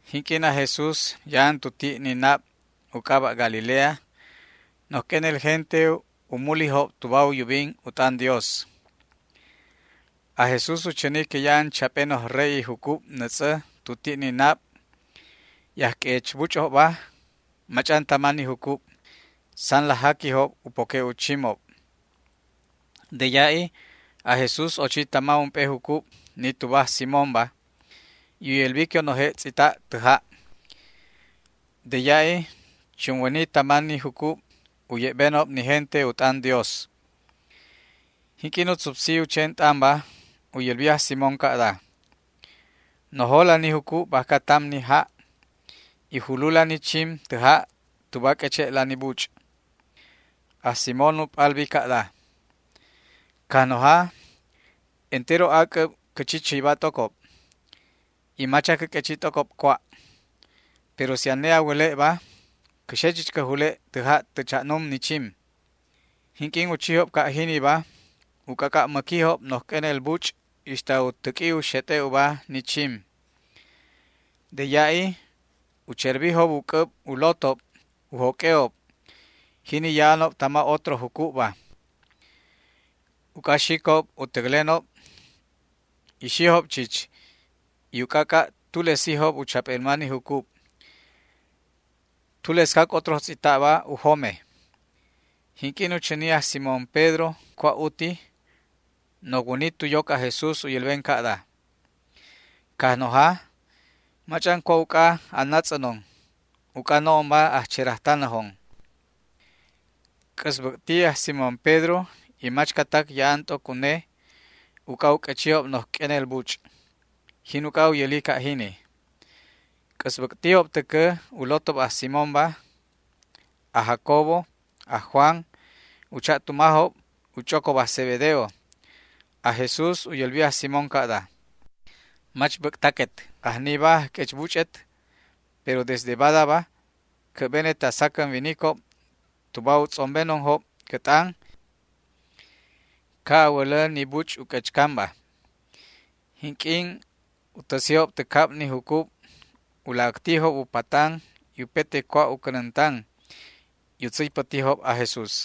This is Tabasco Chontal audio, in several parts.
Jinq'uin aj Jesús ya'an tu ti' ni nab u c'aba' Galilea, noj q'uenel gente u múlijob tuba u yubin u t'an Dios. Aj Jesús u chäni que ya'an chap'e noj re'i jucub nätz'ä tu ti' ni nab, y ajq'uechbuch'obba mach'an tama ni jucub, san laj jaquijob u poque' u chimob. De ya'i aj Jesús ochi tama ump'e jucub, ni tuba aj Simónba, y u yälbi que u noje' tz'ita' tä ja'. De ya'i chunwäni tama ni jucub u ye'benob ni gente u t'an Dios. Jinq'uin u tzupsi u chen t'anba u yälbi aj Simón ca'da: ―Nojola ni jucub bajca tam ni ja' y julula ni chim tä ja' tuba a q'ueche'la ni buch'. Aj Simón u p'albi ca'da: ―Cajnoja, entero ac'äb cä chi chäyba t'ocob, y mach acä q'uechi t'ocob cua', pero si ane a wäle'ba cä xe chich cä jule' tä ja' tä cha'num ni chim. Jinq'uin u chijob ca' jiniba u c'ac'a' mäquijob noj q'uenel buch' ixta u täq'ui u xet'e' uba ni chim. De ya'i u cherbijob u c'äb u lotob u joq'ue'ob, jini ya'anob tama otro jucubba, uc'a xicob u täclenob, y xijob chich y u c'ac'a' tulesijob u chap'elma ni jucub. Tulescac otro tz'ita'ba, u jome. Jinq'uin u chäni aj Simón Pedro cua' uti, nocwäni tu yoc aj Jesús u yälben ca'da: ―Cajnoja, mach'an cua' uc'a a natz'änon, uc'a no'onba ajcherajtanäjon. C'äsbäc'ti aj Simón Pedro y machcatac ya'an t'oc une uc'a u q'uechijob noj q'uenel buch'. Jin uc'a u yäli ca' jini. C'äsbäc'tijob täcä u lotob aj Simónba, aj Jacobo y aj Juan, u cha'tumajob u ch'ocob aj Zebedeo. Aj Jesús u yälbi aj Simón ca'da: ―Mach bäc'taquet. Ajniba ajq'uechbuch'et, pero desde badaba cä'benet a sacän winicob tuba u tz'ombenonjob cä t'an, ca' a wälä ni buch' u q'uechcanba. Jinq'uin u täsijob tä cab ni jucub u laj äctijob u patan y upete cua' u cänäntan y u tzäypätijob aj Jesús.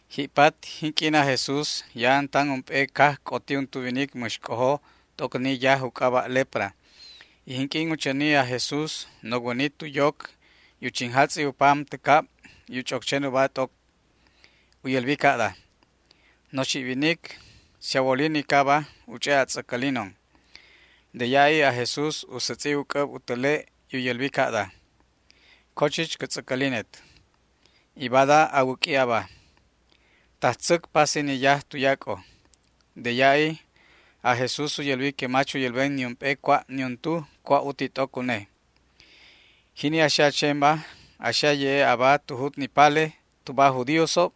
Ji'pat, jinq'uin aj Jesús ya'an tan ump'e caj c'oti untu winic mäx c'ojo t'oc ni yaj u c'aba' lepra, y jinq'uin u chäni aj Jesús nocwäni tu yoc y u chinjatz'i u pam tä cab u ch'oc chen uba t'oc. U yälbi ca'da: ―Noxi' winic, si a wolinicaba u ch'e' a tz'äcälinon. De ya'i aj Jesús u sätz'i u c'äb u täle' y u yälbi ca'da: ―Co chich cä tz'äcälinet, y bada a wäq'ui aba. Tajtzäc pasi ni yaj tuyac'o. De ya'i aj Jesús u yälbi que mach u yälben niump'e cua' niuntu cua' uti t'oc une. Jini a xe a chenba, a xe a ye'e' aba tu jut ni pale tuba aj judíosob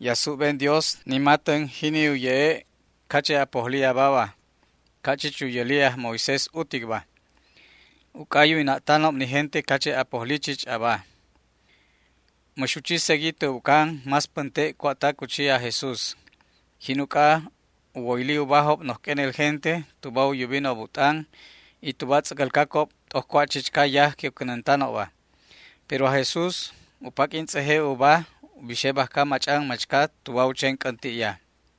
y a subben Dios ni matän jini u ye'e' cache' a pojli ababa, ca' chich u yäli aj Moisés uticba, uc'a u yuwina'tanob ni gente cache' a pojli chich aba. Mäx u chi segui tä ubcan más pänte' cua'tac u chi aj Jesús. Jin uc'a u woyli ubajob noj q'uenel gente tuba u yubinob u t'an y tuba tz'äcälcacob t'oc cua' chichca yaj que u cänäntanobba. Pero aj Jesús u paq'uin tz'eje' uba u bixe bajca mach'an machca tuba u chen c'änti'ya.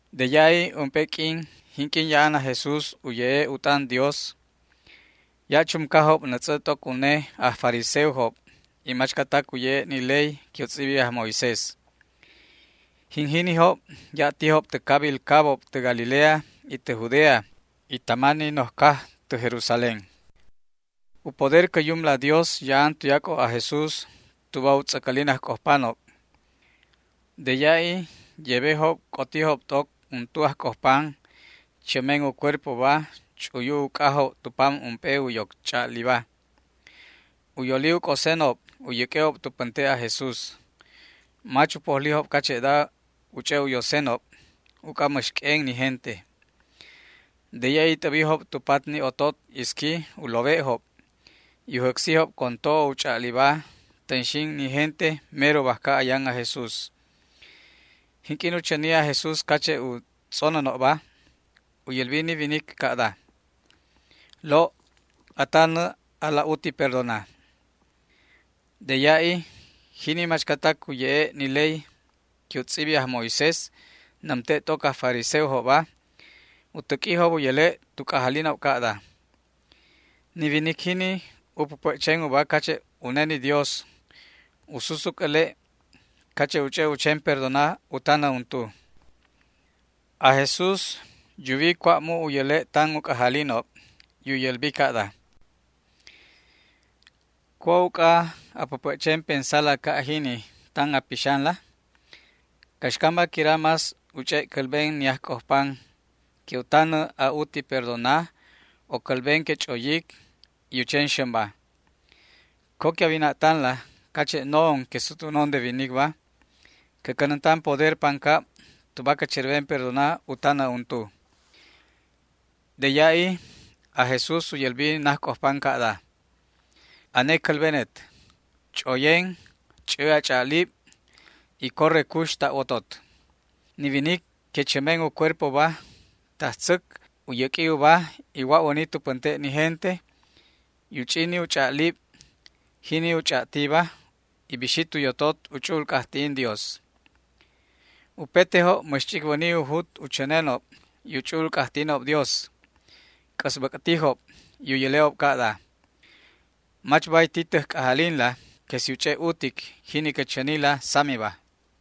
De ya'i ump'e q'uin jinq'uin ya'an aj Jesús u ye'e' u t'an Dios, ya' chumcajob nätz'ä t'oc une aj fariseojob y machcatac u ye'e' ni ley que u tz'ibi aj Moisés. Jin jinijob ya' tijob tä cabil cabob tä Galilea y tä Judea y tama ni noj caj tä Jerusalén. U poder cä Yumla Dios ya'an tuyac'o aj Jesús tuba u tz'äcälin ajc'ojpanob. De ya'i yebejob c'otijob t'oc untu ajc'ojpan chämen u cuerpoba ch'uyu uc'ajob tu pam ump'e u yoc ch'a'liba. U yoli u c'osenob u yäq'ue'ob tu pänte' aj Jesús. Mach u pojlijob cache'da u ch'e' u yosenob uc'a mäx q'uen ni gente. De ya'i t'äbijob tu pat ni otot isqui u lowe'job, y u jäcsijob con to'o u ch'a'liba tänxin ni gente mero bajca ayan aj Jesús. Jinq'uin u chäni aj Jesús cache' u tz'onänjobba u yälbi ni winic ca'da: ―Lo', a tanä alaj uti perdona. De ya'i jini machcatac u ye'e' ni ley que u tz'ibi aj Moisés, nämte' t'oc aj fariseojobba, u täq'uijob u yäle' tu c'ajalinob ca'da: “Ni winic jini u päpä' chen uba cache' une ni Dios. U susuc äle' cache' u ch'e' u chen perdona u tanä untu”. Aj Jesús yuwi cua' mu' u yäle' tan u c'ajalinob, y u yälbi ca'da: ―¿Cua' uc'a a päpä' chen pensala ca' jini tan a pixanla? ¿Caxcamba quira más u ch'e' cälben ni ajc'ojpan, que u tanä a'uti perdona, o cälben que ch'oyic y u chen xämba? Co que a wina'tanla cache' no'on que sutwänon de winicba cä cänäntan poder pancab tuba cä cherben perdona u tanä untu. De ya'i aj Jesús u yälbi najc'ojpan ca'da: ―Ane cälbenet, ch'oyen, ch'ä a ch'a'lib y corre cux ta' wotot. Ni winic que chämen u cuerpoba tajtzäc u yäq'ui uba y wa'wäni tu pänte' ni gente y u ch'i ni u ch'a'lib, jini u ch'a'tiba, y bixi tu yotot u ch'u'ul c'ajti'in Dios. Upetejob mäx ch'icwäni u jut u chänenob y u ch'u'ul c'ajti'inob Dios. C'äsbäc'tijob y u yäle'ob ca'da: ―Mach bay ti täj c'ajalinla que si u ch'e' utic jini cä chänila samiba.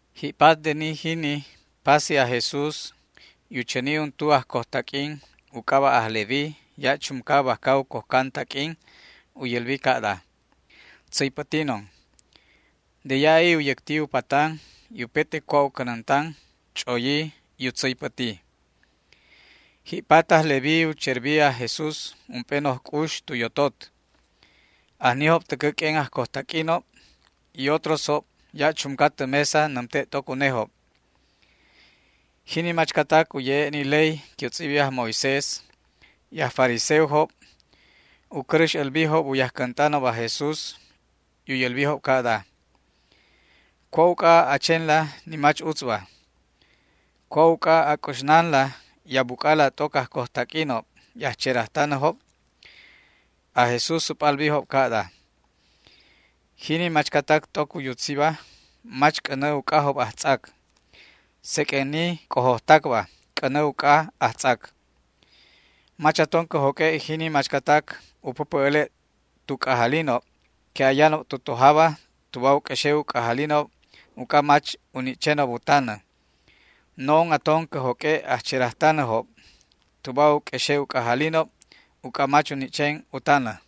Ji'pat de ni jini pasi aj Jesús y u chäni untu ajcojtaq'uin u c'aba' aj Leví ya' chumca bajca u cojcan taq'uin. U yälbi ca'da: ―Tzäypätinon. De ya'i u yäcti u patan y upete cua' u cänäntan, ch'oyi y u tzäypäti. Ji'pat, aj Leví u cherbi aj Jesús ump'e noj c'ux tu yotot. Ajnijob täcä q'uen ajcojtaq'uinob y otrosjob ya' chumca tä mesa nämte' t'oc unejob. Jini machcatac u ye'e' ni ley que u tz'ibi aj Moisés y aj fariseojob u cäräx älbijob u yajcänt'anob aj Jesús y u yälbijob ca'da: ―¿Cua' uc'a a chenla ni mach utzba? ¿Cua' uc'a a c'uxnanla y a buc'ala t'oc ajcojtaq'uinob y ajcherajtanäjob? Aj Jesús u p'albijob ca'da: ―Jini machcatac t'oc u yutziba mach c'änä uc'ajob ajtz'ac, seq'uen ni c'ojojtacba c'änä uc'a ajtz'ac. Mach aton cä joq'ue' jini machcatac u päpä' äle' tu c'ajalinob que ayanob tu tojaba tuba u q'uexe' u c'ajalinob uc'a mach u ni' chenob u tanä. No'on aton cä joq'ue' ajcherajtanäjob tuba u q'uexe' u c'ajalinob uc'a mach u ni' chen u tanä.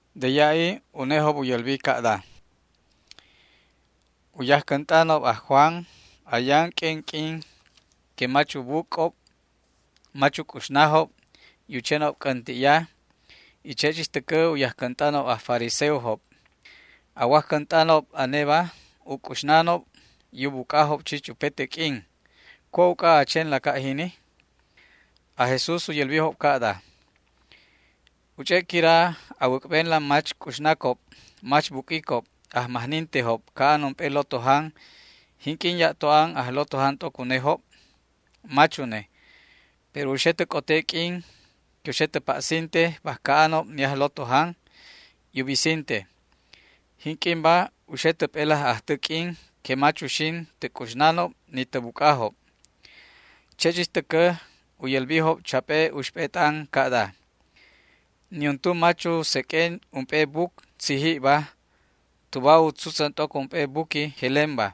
De ya'i unejob u yälbi ca'da: ―U yajcänt'anob aj Juan ayan q'uen q'uin que mach u buc'ob mach u c'uxnajob, u chenob c'änti'ya, y che' chich täcä u yajcänt'anob aj fariseojob. A wajcänt'anob aneba u c'uxnanob y u buc'ajob chich upete q'uin. ¿Cua' uc'a a chenla ca' jini? Aj Jesús u yälbijob ca'da: ―¿U ch'e' quira a wäc'benla mach c'uxnacob mach buq'uicob ajmajnintejob ca'an ump'e lotojan jinq'uin ya'to an ajlotojan t'oc unejob? Mach une. Pero u xe tä c'ote q'uin que u xe tä pa'sinte bajca anob ni ajlotojan y u bisinte. Jinq'uinba u xe tä p'elaj ajtä q'uin que mach uxin tä c'uxnanob ni tä buc'ajob. Che' chich täcä u yälbijob chap'e uxp'e t'an ca'da: ―Niuntu mach u seq'ue ump'e buc tzijibba tuba u tzutzän t'oc ump'e buqui jelemba,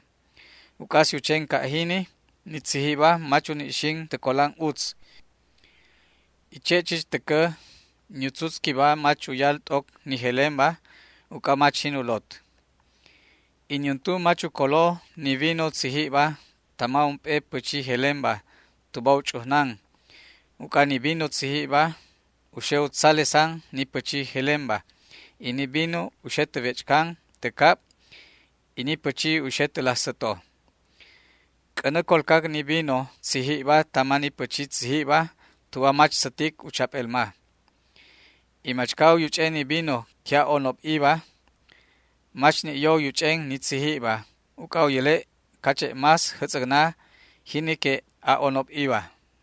uc'a si u chen ca' jini, ni tzijibba mach uni' xin tä colan utz, y che' chich täcä ni u tzutzquiba mach uyal t'oc ni jelemba uc'a mach jin u lot. Y niuntu mach u colo ni vino tzijibba tama ump'e pächi jelemba tuba u ch'ujnan, uc'a ni vino tzijibba u xe u tzalesan ni pächi jelemba y ni vino u xe tä wech'can tä cab y ni pächi u xe tä laj säto. C'änä colcac ni vino tzijibba tama ni pächi tzijibba tuba mach sätic u chap'elma. Y machca u yuch'en ni vino que a'onob'iba mach ni' yo u yuch'en ni tzijibba, uc'a u yäle' cache' más jätz'äcna jini que a'onob'iba.